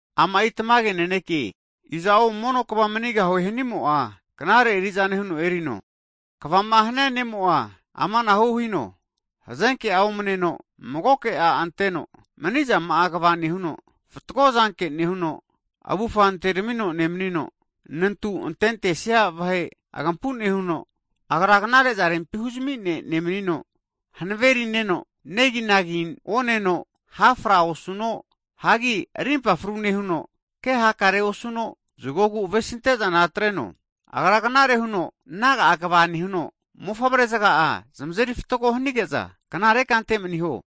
Ama'i tamage naneke, iza'o mono kva manigahue hanimo'a, knare eri'zane huno erino. Kvama hania ne'mo'a amanahu hino, hazenke'a omneno, magoke a' anteno, manizama'a kva nehuno, fatgo zanke nehuno, avufa antermino nemnino, nantu antentesia vahe agampu nehuno, agra knare'za rempi huzmi ne' nemnino, hanave rina neno negi oneno, hafra osuno, hagi arimpa fru nehuno, ke hakare osuno, zgogu avesinte'zana atreno. Agra knare huno naga'a kva nehuno, mofavre zga'a zamazeri fatgo hanige'za, knare kante maniho.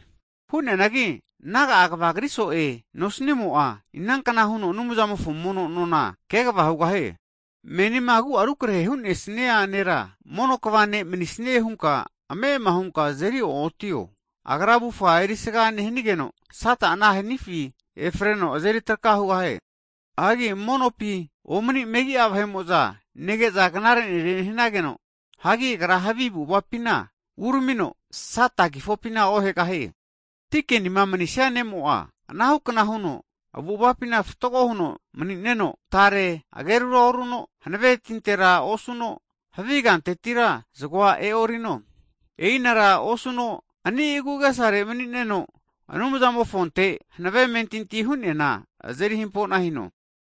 Hu'neanagi naga'a kvagri so'e nosnimo'a, ina kna huno Anumzamofo mono' nona kegva hugahie? Menima agu'a rukrahe hu'nesnia nera, mono kva ne' manisnie hunka ame'ama hunka azeri o'otio. Agra avufa erisaga nehnigeno Sata'a ana hanifi efreno azeri traka hugahie. Hagi monopi omani megi'a vahe'mo'za nege'za, knare nere nehnageno, agra havi avu'avapina uramino Sata krifufina ohegahie. Dikenima manisia ne'mo'a, anahu kna huno avu'avapina fatgo huno mani'neno, tare agerura oruno, hanave tintera osuno, havi kantetira zgoa e'orino, e'inara osuno ani' agu' agesare mani'neno, Anumzamofonte hanave amentinti hu'neana, azeri hampo'na hino.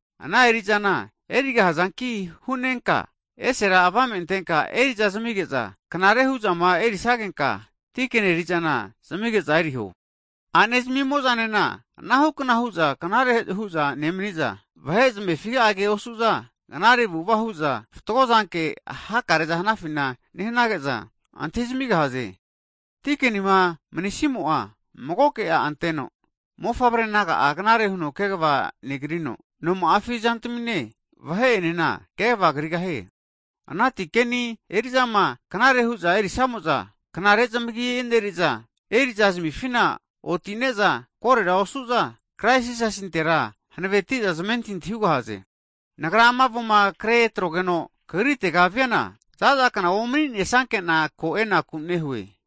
Ana eri'zana erigahazanki hu'nenka, esera avame antenka eri'za zamige'za knare hu'zama erisagenka, dikeni eri'zana zamige'za eriho. A'ne zamimo'zanena anahu kna hu'za knare hu'za nemni'za, vahe zamefi'a ke osu'za, knare avu'ava hu'za fatgo zanke hakareza hanafina nehnage'za antahi zamigahaze. Dikenima manisimo'a magoke a' anteno, mofavre naga'a knare huno kegva negrino, noma'afi zantmine, vahe enena kegva krigahie. Ana dikeni eri'zama knare hu'za erisamo'za knare zamagi eneriza, eri'za zamifina otine'za, korera osu'za Krais Jisasintera hanaveti'za zamentinti hugahaze. Nagra ama avoma kre atrogeno kagritega viana, zaza kna omninesakena ko e'naku nehue.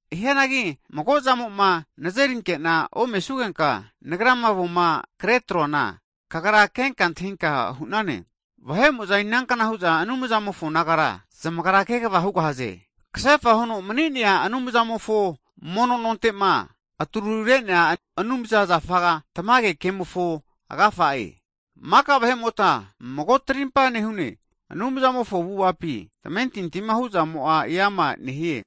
Hianagi mago'a zamo'ma nazerinke'na omesugenka, nagrama avoma kre troana kagra kenka antahinka hu'nane, vahe'mo'za inankna hu'za Anumzamofo nagara zamagra kegva hugahaze, kasefa huno mni'nea Anumzamofo mono nonte'ma, atru re'nea anumza zafa, tamage kemofo agafa'e. Maka vahe'mota mago trimpa nehune, Anumzamofo avu'avapi tamentintima hu'zamo'a eama nehie,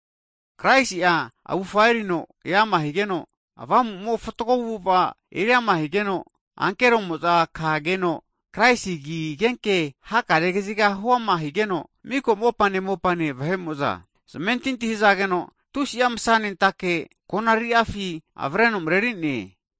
Kraisi'a avufa erino eama higeno, Avamu'mo fatgo avu'ava eriama higeno, ankero'moza kageno, Kraisi agi agenke hakare kaziga huama higeno, miko mopane mopane vahe'mo'za zamentinti hzageno, tusi'a msa'nentake konariri'afi avreno mreri'ne.